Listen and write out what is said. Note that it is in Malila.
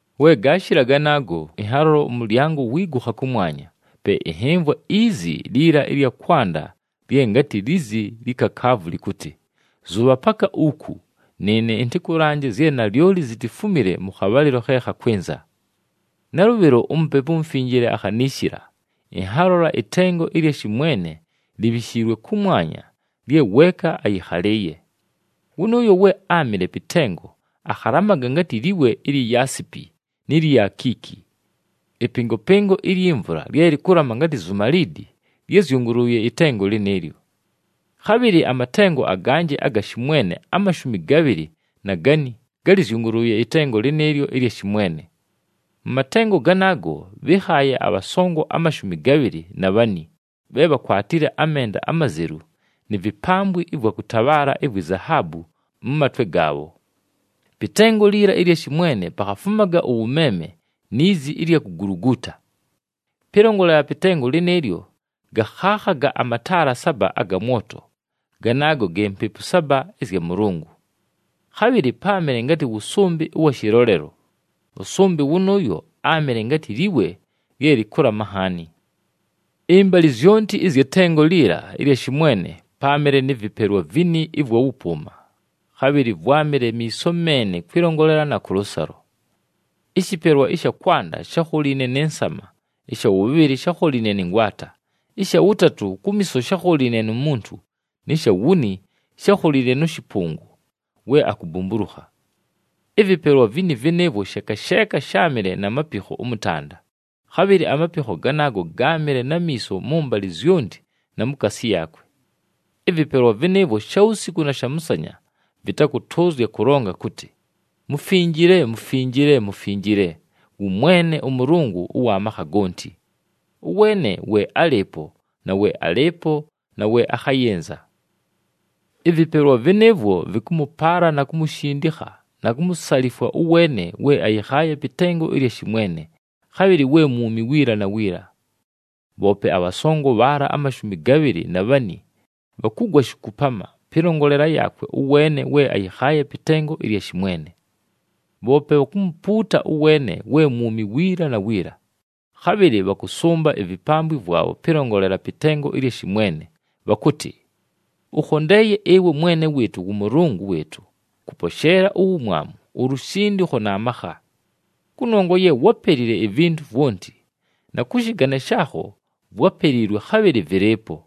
We gaashɨla ganaago, ɨnhalola ʉmʉlyango wiigukha kʉmwanya. Pe ɨnhɨmvwa izi liila ɨlya kwanda lye ngatɨ lizi lyi kakaavu lɨkʉtɨ, “Zʉbha paka uku, nɨɨne ɨntɨkʉlanje zye nalyoli zitifumile mʉ khabhalɨlo khe khakwɨnza.” Nalʉbhɨlo, uMupepu uMufinjile akhaniishila, ɨnhalola ɨtengo ɨlya shɨmwene libhishiilwe kʉmwanya lye weeka ayɨkhalɨɨye. Wʉnʉʉyo we áamɨle pɨ tengo akhalamaga ngatɨ liwe ɨlya yaasipi ni lyi akiiki. Ɨpɨngopɨngo ilyi mvula lye lɨkʉlama ngatɨ zumaliidi, lyázyʉngʉlʉʉye ɨtengo lɨnɨɨlyo. Khabhɨlɨ amatengo aganjɨ aga shɨmwene amashumi gabhɨlɨ na gani gálɨzyʉngʉlʉʉye ɨtengo lɨnɨɨlyo ɨlya shɨmwene. Mʉ matengo ganaago bhɨ́khaaye abhasongo amashumi gabhɨlɨ na bhani bhe bhakwatile amenda amazelu ni vipambwi ɨvwa kʉtabhaala ivwi zahaabu mʉ matwe gaabho. Pɨ tengo liila ɨlya shɨmwene pakhafumaga ʉwʉmeeme ni zi ɨlya kuguluguuta. Pɨlongolela pɨ tengo lɨnɨɨlyo, gakhakhaga amataala saba aga mwoto, ganaago ge Mpepu saba ɨzya Mʉlʉngʉ. Khabhɨlɨ páamɨle ngatɨ wʉsʉmbɨ ʉwa shɨlolelo. Ʉsʉmbɨ wʉnʉʉyo áamɨle ngatɨ liwe lye lɨkʉlama nhaani. Ɨmbalɨ zyonti ɨzyɨ tengo liila ɨlya shɨmwene, páamɨle nɨ vɨpelwa vini ɨvwa wʉpʉʉma, khabhɨlɨ vwámɨle miiso meene kwɨlongolela na kʉlʉsalo. Ɨshɨpelwa ɨsha kwanda shákholiine nɨ nsama, ɨsha wʉbhɨlɨ shákholiine nɨ ngwata, ɨsha wʉtatʉ kumiiso shákholiine nu muntu nɨ sha wuni shákholiine nʉ shɨpʉngʉ we akubumbulukha. Ɨvɨpelwa vini vɨnɨɨvwo sheeka sheeka sháamɨle na mapikho ʉmʉtanda, khabhɨlɨ amapikho ganaago gáamɨle na miiso mʉmbalɨ zyonti na mukaasi yaakwe. Ɨvɨpelwa vɨnɨɨvwo shawusiku na shamʉsanya vɨtakʉtʉʉzya kʉlonga kʉtɨ, “Mufinjile, Mufinjile, Mufinjile, wʉ Mwene ʉMʉlʉngʉ ʉwa makha gonti, ʉweene we álɨɨpo na we alɨɨpo na we akhayɨnza.” Ɨvɨpelwa vɨnɨɨvwo vɨkʉmʉpaala na kumushindikha na kumusalifwa ʉweene we ayɨkhaaye pɨ tengo ɨlya shɨmwene, khabhɨlɨ we mwumi wiila na wiila. Bhoope abhasongo bhaala amashumi gabhɨlɨ na bhani bhakʉgwa shikupama, pɨlongolela yaakwe ʉweene we ayɨkhaaye pɨ tengo ɨlya shɨmwene. Bhoope bhakumupuuta ʉweene we mwumi wiila na wiila, khabhɨlɨ bhakʉsʉmba ivipambwi vwabho pɨlongolela pɨ tengo ɨlya shɨmwene. Bhakʉtɨ, “Ʉkhondeeye ɨwe Mwene wɨɨtʉ, wʉMʉlʉngʉ wɨɨtʉ, kʉposheela uwumwamu, ulushindikho na makha. Kʉnongwa ye wápelile ivintu vwonti, na kʉ shɨgane shaakho vwápeliilwe, khabhɨlɨ vɨlɨɨpo.”